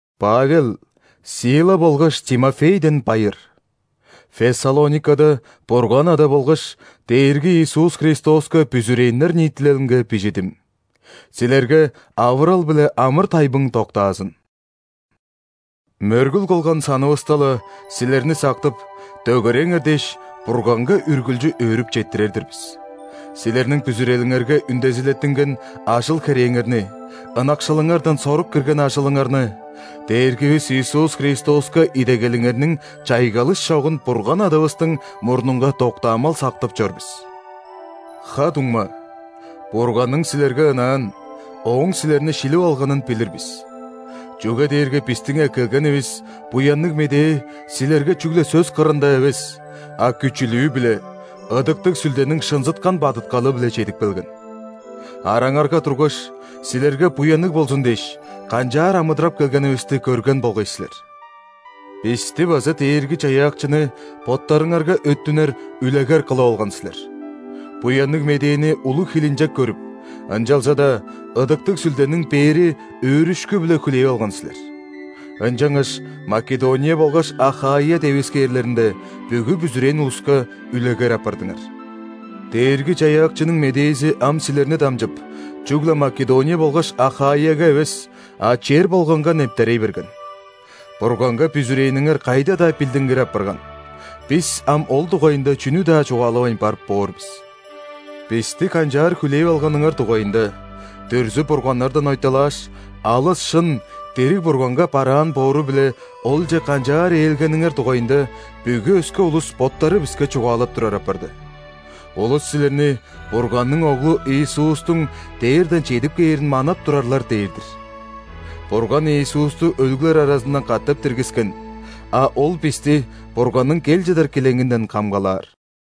Павел, Сила болгаш Тимофейден байыр! Фессалоникада Бурган Ада болгаш Дээрги Иисус Христоска бүзүрээннер ниитилелинге бижидим. Силерге авырал биле амыр-тайбың доктаазын! Мөргүл кылган санывыста-ла, силерни сактып, дөгереңер дээш, Бурганга үргүлчү өөрүп четтирер-дир бис. Силерниң бүзүрелиңерге үндезилеттинген ажыл-херээңерни, ынакшылыңардан сорук кирген ажылыңарны, Дээргивис Иисус Христоска идегелиңерниң чайгылыш чогун Бурган Адавыстың мурнунга доктаамал сактып чор бис. Ха-дуңма, Бурганның силерге ынаан, Ооң силерни шилип алганын билир бис. Чүге дээрге бистиң эккелгенивис Буянныг Медээ силерге чүгле сөс кырында эвес, а күчүлүү-биле, Ыдыктыг Сүлдениң шынзыткан бадыткалы-биле чедип келген. Араңарга тургаш, силерге буянныг болзун дээш, канчаар амыдырап келгенивисти көрген болгай силер. Бисти база Дээрги-Чаяакчыны боттарыңарга өттүнер үлегер кылып алган силер. Буянныг Медээни улуг хилинчек көрүп, ынчалза-даа Ыдыктыг Сүлдениң бээри өөрүшкү-биле хүлээп алган силер. Ынчангаш Македония болгаш Ахаия девискээрлеринде бүгү бүзүрээн улуска үлегер апардыңар. Дээрги-Чаяакчының медээзи ам силерни дамчып, чүгле Македония болгаш Ахаияга эвес, а чер болганга нептерей берген. Бурганга бүзүрээниңер кайда-даа билдингир апарган, бис ам ол дугайында чүнү-даа чугаалавайн барып боор бис. Бисти канчаар хүлээп алганыңар дугайында, дүрзү-бурганнардан ойталааш, алыс шын дириг Бурганга бараан боору-биле Олче канчаар ээлгениңер дугайында бүгү өске улус боттары биске чугаалап турар апарды. Улус силерни Бурганның Оглу Иисустуң дээрден чедип кээрин манап турарлар дээр-дир. Бурган Иисусту өлүглер аразындан катап диргискен, а Ол бисти Бурганның кел чыдар килеңинден камгалаар.